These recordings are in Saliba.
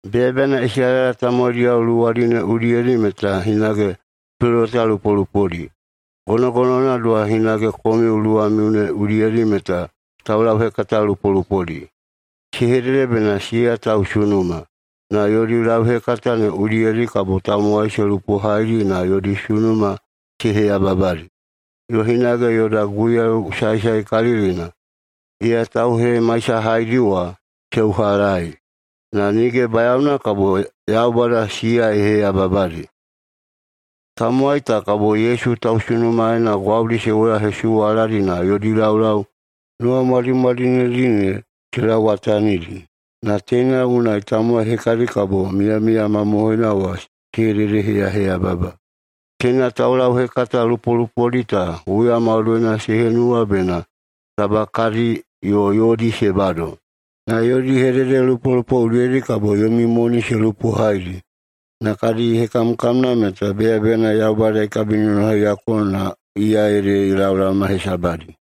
Beyabeyana Isalaela tamowaidiyao luwadi ne udiyedi meta hinage peloweta lupolupodi, gonogonowana doha hinage komiu luwamiu ne udiyedi meta taulauhekata lupolupodi. Se hedede bena siya tausunuma, na yodi lauhekata ne udiyedi kabo tamowai se lupohaidi na yodi sunuma se heyababadi, yo hinage yoda Guiyau Saesaekalilina, iya tauhemaisahaidi wa, se uhalaei. Na nige bayaona kabo Yaubada siya ye heyababadi. Tamowai ta kabo Yesu tausunumaena gwaudi se woyahesuwaladi na yodi laulau nuwamwadimwadinedi ne se lauwatanidi, na teina unai tamowai hekadi kabo miyamiya mamohoina wa se hededeheyaheyababa. Teina taulauhekata lupolupodi ta huya maudoina se henuwa bena taba kadi yo yodi se bado, na yodi hededelupolupo udiyedi kabo yomi moni se lupohaidi. Na kadi hekamkamna meta beyabeyana Yaubada ye kabinonohaiyako na iya ede ye laolaoma hesabadi.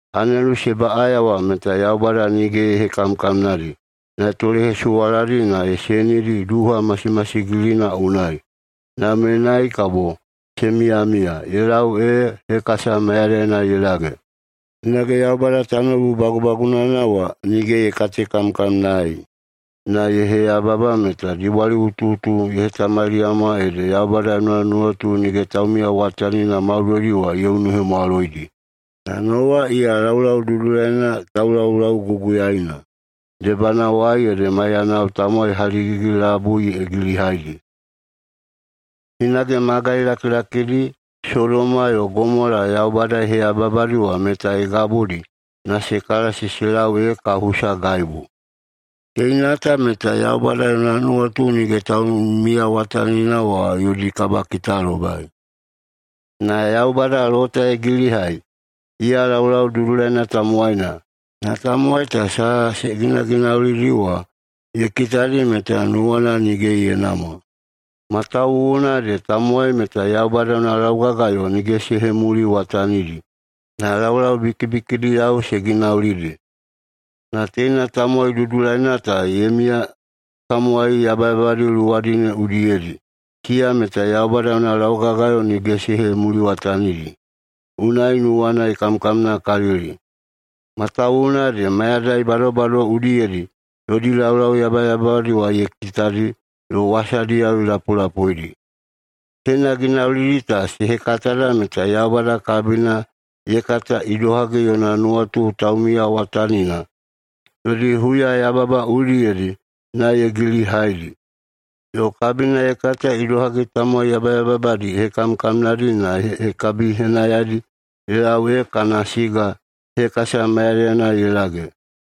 Anelu se baꞌaya wa meta Yaubada nige ye katekamkamnaedi na ye tolehesuwaladi na ye senidi duha masimasigilina unai. Na menai kabo se miyamiya ye lau ee hekasa mayadaina ye lage. Hinage Yaubada tanoubu bagubagunana wa nige ye katekamkamnaei na ye heyababa meta dibwaliꞌutuꞌutu ye hetamaliyama ede Yaubada yona nuwatu nige taumiyawatanina maudoidi wa ye unuhemwaloidi. Na Nowa iya laulau dudulaina taulaulauguguyaina, debanawai ede maiyanao tamowai haligigi-labui ye gilihaidi. Hinage magai lakilakidi Sodoma yo Gomola Yaubada ye heyababadi wa meta ye gabudi na se kalasi se lau ee kahusa gaibu. Teina ta meta Yaubada yona nuwatu nige taumiyawatanina wa yodi kabakitalobai. Na Yaubada Lota ye gilihai. Iya laulau dudulaina tamowaina, na tamowai ta saha se ginaginaulidi wa ye kitadi meta nuwana nige ye namwa, matawuwuna ede tamowai meta Yaubada yona laugagayo nige se hemuliwatanidi, na laulau bikibikidiyao se ginaulidi. Na teina tamowai dudulaina ta ye miya tamowai yabayababadi luwadi ne udiyedi. Siya meta Yaubada yona laugagayo nige se hemuliwatanidi, unai nuwana ye kamkamnakalili, matawuwuna ede mayadai badobado udiyedi yodi laulau yabayababadi wa ye kitadi yo wasadiyao ye lapulapuidi. Teina ginaulidi ta se hekatada meta Yaubada kabina ye kata idohagi yona nuwatu taumiyawatanina yodi huyayababa udiyedi na ye gilihaidi. Yo kabina ye kata idohagi tamowai yabayababadi ye hekamkamnadi na ye kabihekahinidi ye lau ee kana siga hekasa mayadaina ye lage.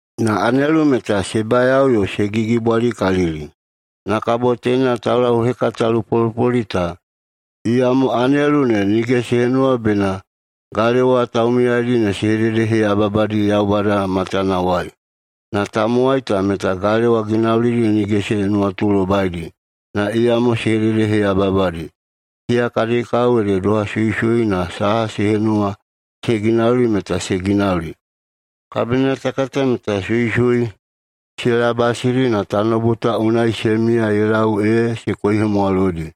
Na anelu meta se bayao yo se gigibwalikalili, na kabo teina taulauhekata lupolupodi ta. Iyamo anelu ne nige se henuwa bena galewa taumiyaidi ne se hededeheyaheyababadi Yaubada matanawai. Na tamowai ta meta galewa ginaulidi nige se nuwatulobaidi, na iyamo se hededeheyaheyababadi. Siya kadi kao ede doha suisui na saha se henuwa se ginauli meta se ginauli. Kabina ta kata meta suisui se labasidi na tanoubu ta unai se miya ye lau ee se koihemwaloidi.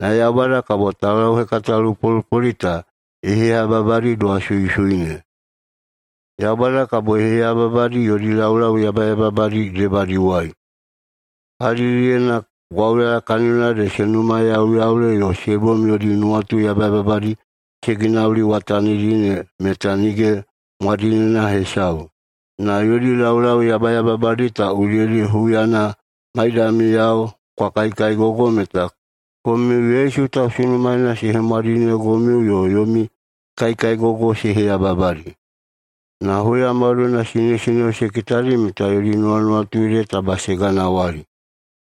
Na Yaubada kabo taulauhekata lupolupodi ta ye heyababadi doha suisui ne. Yaubada kabo ye heyababadi yodi laulau yabayababadi debadiwai. Kalidiyena gwauyala kaniyona ede se numayauyaule yo se bom yodi nuwatu yabayababadi se ginauliwatanidi ne meta nige mwadinena hesau. Na yodi laulau yabayababadi ta udiyedi huyana maidamiyao kwa kaikaigogoi meta komiu Yesu tausunumaena se hemwadinegomiu yo yomi kaikaigogoi se heyababadi. Na huya maudoina sinesineo se kitadi meta yodi nuwanuwatu ede taba se ganawali.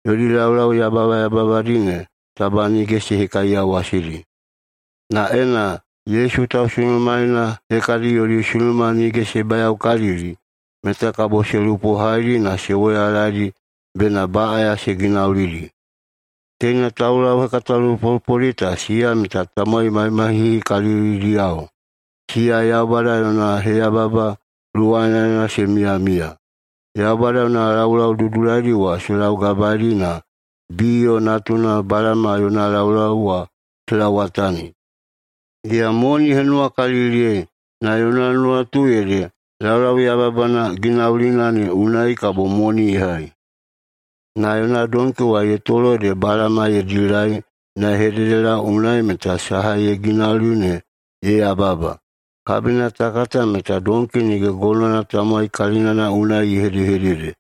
Yodi laulau yabayababadi ne taba nige se hekaiyawasidi. Na ena Yesu tausunumaena hekadi yodi sunuma nige se bayaokalili, meta kabo se lupohaidi na se woyalaedi bena baꞌaya se ginaulidi. Teina taulauhekata lupolupodi ta siya meta tamowai mahimahihikalilidiyao. Siya Yaubada yona heyababa luwanaena se miyamiya. Yaubada yona laulau dudulaidi wa se laugabaeidi na Biyo natuna Balama yona laulau wa se lauwatani. Iya moni ye henuwakaliliyei, na yona nuwatu ede laulau yabayababana ginaulina ne unai kabo moni ye hai. Na yona donki wa ye tolo ede Balama ye dilai na ye hededelau unai meta saha ye ginauli ne ye yababa. Kabina ta kata meta donki nige gonowana tamowai kalinana unai se hedehedede,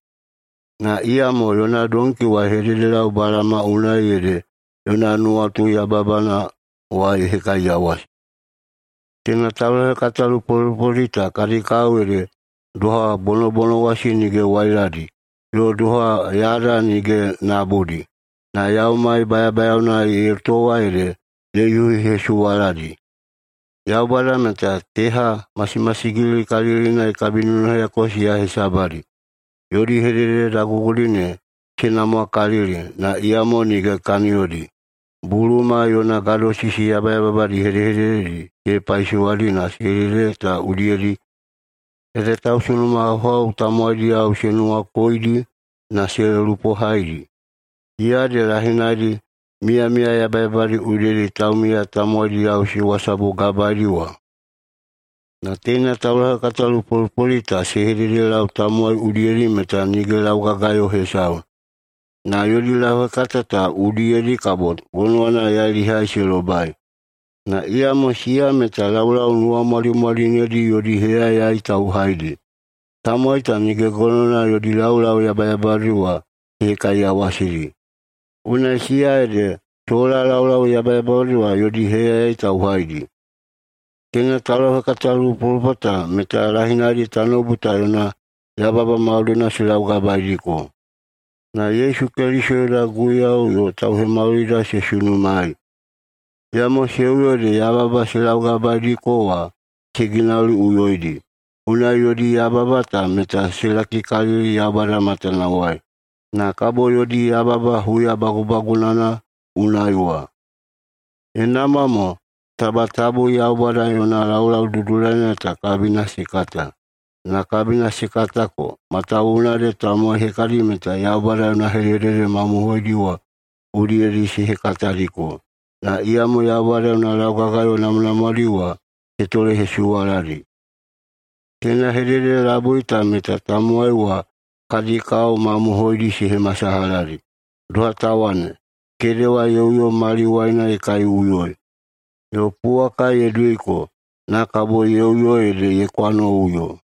na iyamo yona donki wa ye hededelau Balama unai, ede yona nuwatu yababana wa ye hekaiyawasi. Teina taulauhekata lupolupodi ta kadi kao ede doha bonobonowasi nige wailadi, yo doha yada nige nabudi, na yaumai bayabayaona ye towa ede ye yuhihesuwaladi. Yaubada meta teha masimasigilikalilina ye kabinonohaiyako siya hesabadi. Yodi hedehedede dagugudi ne se namwakalili, na iyamo nige kaniyodi. Buluma yona gadosisi yabayababadi hedehedededi se hepaisowadi na hedehedede ta udiyedi ede tausunumahauhau tamowaidiyao se nuwakoidi na se lupohaidi, siya ede lahinaidi miyamiya yabayababadi udiyedi taumiya tamowaidiyao se wasabugabaedi wa. Na teina taulauhekata lupolupodi ta se hededelau tamowai udiyedi meta nige laugagayo hesau, na yodi lauhekata ta udiyedi kabo gonowana yailihai se lobai. Na iyamo siya meta laulau nuwamwadimwadinedi yodi heyayai tauhaidi. Tamowai ta nige gonowana yodi laulau yabayababadi wa se hekaiyawasidi, unai siya ede sola laulau yabayababadi wa yodi heyayai tauhaidi. Teina taulauhekatalupolupo ta meta lahinaidi tanoubu ta yona yababa maudoidi se laugabaediko na Yesu Keliso yoda Guiyau yo Tauhemaulida se sunumaei, iyamo se uyo ede yababa se laugabaediko wa se ginauliꞌuyoidi. Unai yodi yababa ta meta se lakikalili Yaubada matanawai, na kabo yodi yababa huya bagubagunana unai wa. Ye namwa mo taba tabu Yaubada yona laulau dudulaina ta kabina se kata. Na kabina se katako, matawuwuna ede tamowai hekadi meta Yaubada yona hedehedede mamohoidi wa udiyedi se hekatadiko. Na iyamo Yaubada yona laugagayo namwanamwadi wa se tolehesuwaladi. Teina hedehedede labui ta meta tamowai wa kadi kao mamohoidi se hemasalahadi, doha ta wane, “Kedewa ye uyo maliwaina ye kaiꞌuyoi”, yo, “Puwaka ye duiko, na kabo ye uyo ede ye kwanoꞌuyo.”